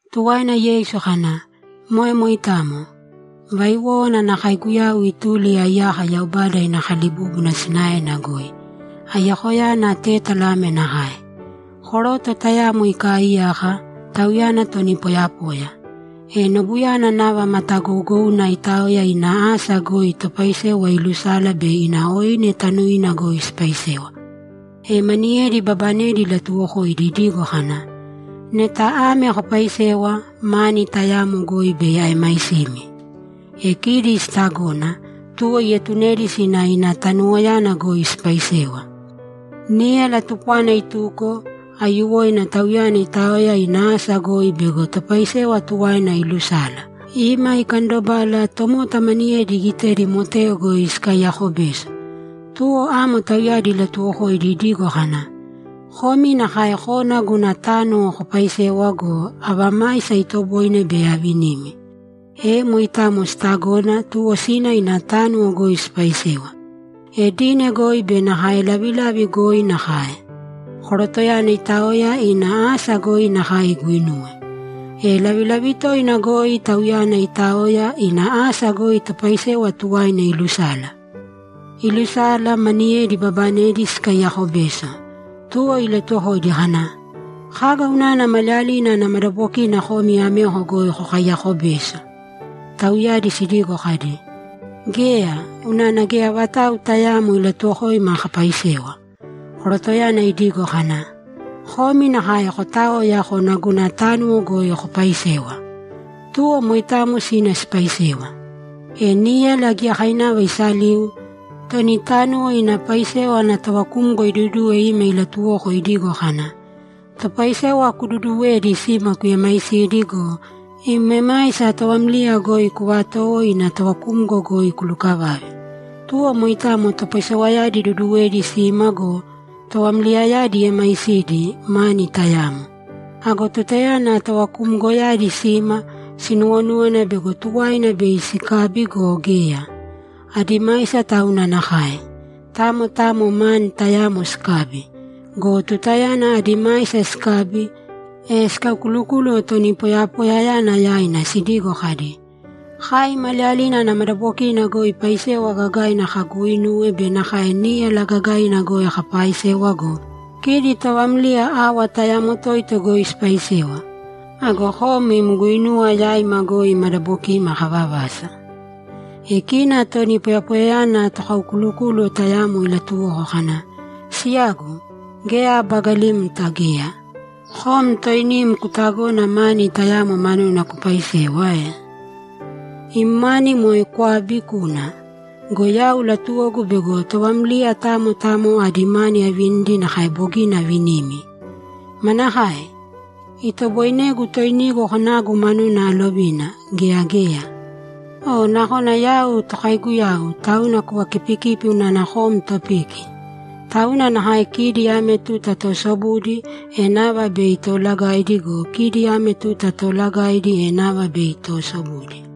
Tuwaina Yeisu kana, ‘Moe moitamo. Vaiwówana ana kaiguyau ituli aiyako Yaubada ina kalibúbuna sinaena goi. Aiyakoyana tétala ame nakae: Koroto tayamo ikaaiyaka, tauyana toni poyapoya. E nobuyana nava matagougouna itaoya ina asa goi topaisewa ilusala bei ina oine tanuina goi sipaisewa. E maniyedi ibabanedi ilatuwokoidi idigo kana, “Neta ame kopaisewa, mani tayamo goi bei aemaisimi.” E kidi sitagona, tuwo ietunedi sina ina tanuwoyana goi sipaisewa. Níyala tupwana ituko, aiyuwoina tauyana itaoya ina asa goi bego topaisewa tuwaina ilusala. Ima ikandobala, tomota maniyedi igitedi moteo goi sikaiyako beso. Tuwo amo tauyadi ilatuwokoidi idigo kana, “Komi nakae kōna guna tánuwo kopaisēwa go, ava maisa itoboine, bei avinimi.” E moitamo sitagona, tuwo sina ina tánuwo goi sipaisewa. E dine goi be nakae lavilavi goi nakae. Korotoyana itaoya ina asa goi nakae iguinuwe. E lavilavi toina goi tauyana itaoya, ina asa goi topaisewa tuwaina ilusala. Ilusala, maniyedi ibabanedi sikaiyako beso. Tuwo ilatuwokoidi kana, “Kaga unana maliyalina ana madabokina komi ameko goi kokaiyako beso?” Tauyadi sidigo kadi, “Geya, unana geya vatau tayaamo ilatuwokoima kapaisewa.” Korotoyana idigo kana, “Komi nakae kotāoya kōna guna tánuwo goi kopaisēwa.” Tuwo moitamo sina sipaisewa. E níyala giyakainava isaliu, toni tánuwo ina paisewa ana tovakumgo iduduwe ima ilatuwoko idigo kana, “Topaisewa kududuwēdi sima kuemaisīdi go, im emaisa továmliya goi kuvatōwo ina tovakumgo goi kulukavāve.” Tuwo moitamo topaisewayadi iduduwedi sima go, tovamliyayadi iemaisidi, mani tayamo. Ago tutayana tovakumgoyadi sima, sinuwonúwana bego tuwaina bei sikabi go, geya; adi maisa tauna nakae. Tamo tamo mani tayamo sikabi. Go tutayana adi maisa sikabi, e sikaukulukúluwo toni poyapoyayana yaina sidigo kadi, “Kai maliyalina ana madabokina goi paisewa gagaina kaguuinuwe be nakae níyala gagaina goi kapaaisewa go, kidi továmliya awa tayamo toito goi sipaisewa. Ago kom im guinuwa yaima goi madabokima kavavasa.” E kina toni poyapoyayana tokaukulukúluwo tayamo ilatuwoko kana, “Siyagu, geya abagalimta geya. Kom toinim kutagona mani tayamo manuna kupaisewa ae? Im mani moe kwābi, kūna. Go yau latuwogu bego továmliya tamo tamo adi mani avinidi nakae bogina avinimi. Manakae? Itoboinegu toinigu konagu manuna alovina, gea geya? O nakona yau tokaiguyau, tauna kuvakipikipi unana kom topiki?” Tauna nakae kidi ame tuta toosobudi, e nava bei toolagaidi go, kidi ame tuta toolagaidi, e nava bei toosobudi.’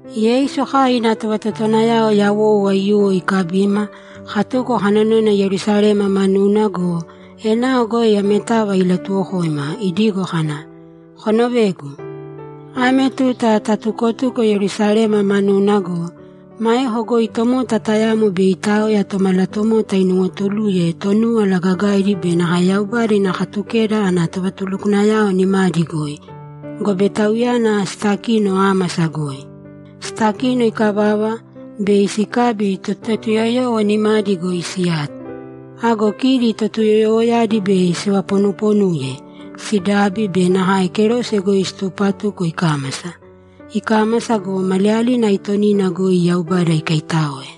Yeisu kai ina tovatotowanayao yawou aiyuwo ikabima, katuko kanonoina Yerusalema manuna go, enao goi ametava ilatuwokoima, idigo kana, ‘Konovēgu. Ame tuta tatukotuko Yerusalema manuna go, maeko goi tomota tayamo bei itaoya Tomalatomota inuwotuluye Tonúwala Gagaidi be nakae Yaubada ina Katukeda ana tovatulukwanayao nimadi goi, gobe Tauyana sitakino ámasa goi. Sitakino ikavava, bei sikabi, Totuyoyowo nimadi goi siyato. Ago kidi Totuyoyowoyadi bei sivaponuponuye, sidabi be nakae kerose goi situpatuko ikámasa. Ikámasa go, maliyalina aitonina goi Yaubada ikaitáoe.’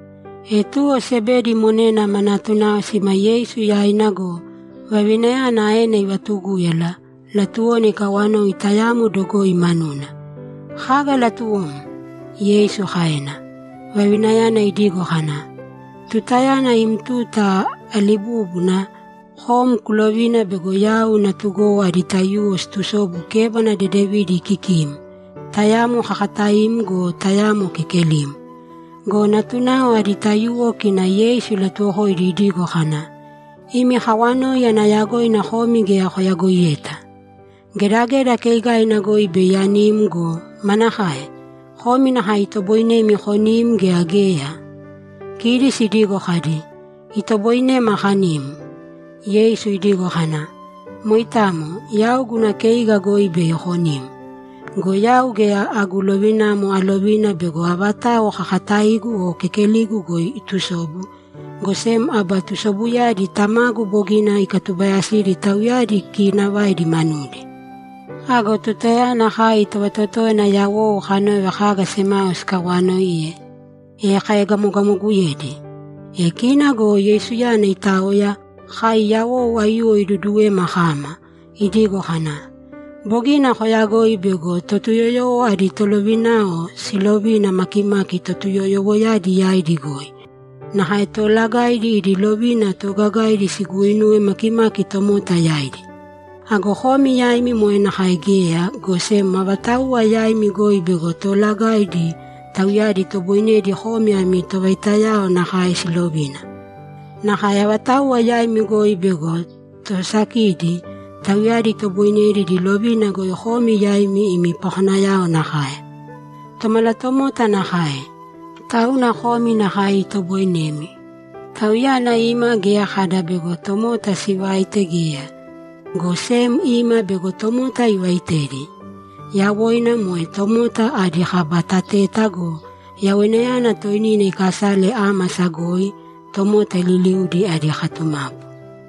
E tuwo Sebedi monena ma natunao sima Yeisu yaina go, vavinayana aena ivatugúyala; latuwona ikawanoi tayamo dogoi manuna. ‘Kaga latuwom?’ Yeisu kaena. Vavinayana idigo kana, ‘Tutayana im tuta alibúbuna, kom kulovīna bego yau natugowo adi taiyuwo situsobu kébana dedevidi kikim, tayamo kakataim go, tayamo kekelim.’ Go natunao adi taiyuwo kina Yeisu ilatuwokoidi idigo kana, ‘Imi kawanoi ana yagoina komi geya koyagoiyeta. Gedageda keigaina goi bei anim go, manakae? Komi nakae itoboinemi konim gea geya?’ Kidi sidigo kadi, ‘Itoboinema kanim.’ Yeisu idigo kana, ‘Moitamo, yau guna keiga goi bei konim. Go yau geya agu lovinamo alovina bego avatau kakataigu o kekeligu goi itusobu, go sem aba tusobuyadi Tamagu bogina ikatubayasidi tauyadi kiinavaidi manudi.’ Ago tutayana kai tovatotówana yawou kanove kaga semao sikawaanoiye, e kaegamogamoguyedi. E kina go Yeisuyana itaoya, kai yawou aiyuwo iduduwema kama, idigo kana, ‘Bogina koyagoi bego Totuyoyowo adi tolovinayao siilovina makimaki Totuyoyowoyadi yaidi goi. Nakae toolagaidi idi lovina toogagaina siguuinuwe makimaki tomota yaidi. Ago komi yaimi moe nakae geya, go sem avatauwa yaimi goi bego toolagaidi, tauyadi itoboinedi komi ami tovaitayao nakae silovina. Nakae avatauwa yaimi goi bego toosakidi, tauyadi itoboinedi idi lovina goi komi yaimi imi pakonayao nakae. Tomalatomota nakae, tauna komi nakae itoboinemi. Tauyana ima geya kada bego tomota sivaite geya, go sem ima bego tomota ivaitedi. Yawoina moe tomota adi kaba tateta go, yawoinayana toinina ikasale ámasa goi, tomota liliudi adi katumapu.’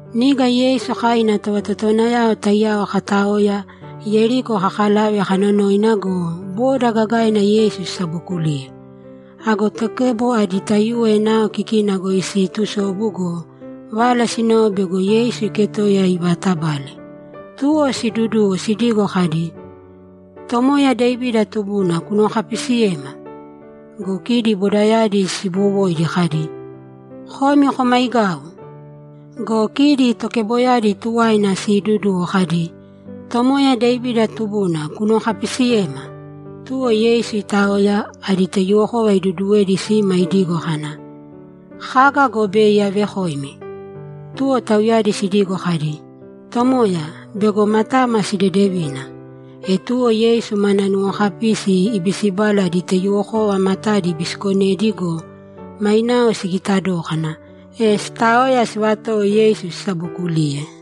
Niga Yeisu kai ina tovatotowanayao taiyao kataoya, Yeriko kakalave kanonoina go, boda gagaina Yeisu sisabookuliye. Ago tokebo adi taiyuwo enao kikina goi siitusobu go, vala sinove bego Yeisu iketoiya ivaatabale. Tuwo siiduduwo sidigo kadi, ‘Tomoya Devida tubuna, kunuwokapisiyēma!’ Go kidi bodayadi siibowoidi kadi, ‘Komi komaigāu!’ Go kidi tokeboyadi tuwaina siiduduwo kadi, ‘Tomoya Devida tubuna, kunuwokapisiyēma!’ Tuwo Yeisu itaoya, adi taiyuwokova iduduwedi sima idigo kana, ‘Kaga go bei avekoimi?’ Tuwo tauyadi sidigo kadi, ‘Tomoya, bego matama sidedevina.’ E tuwo Yeisu mana nuwokapisi ibisibala adi taiyuwokova matadi ibisikonedi go, mainao sigita dókana, e sitaoya sivatowo Yeisu sisabokuliye.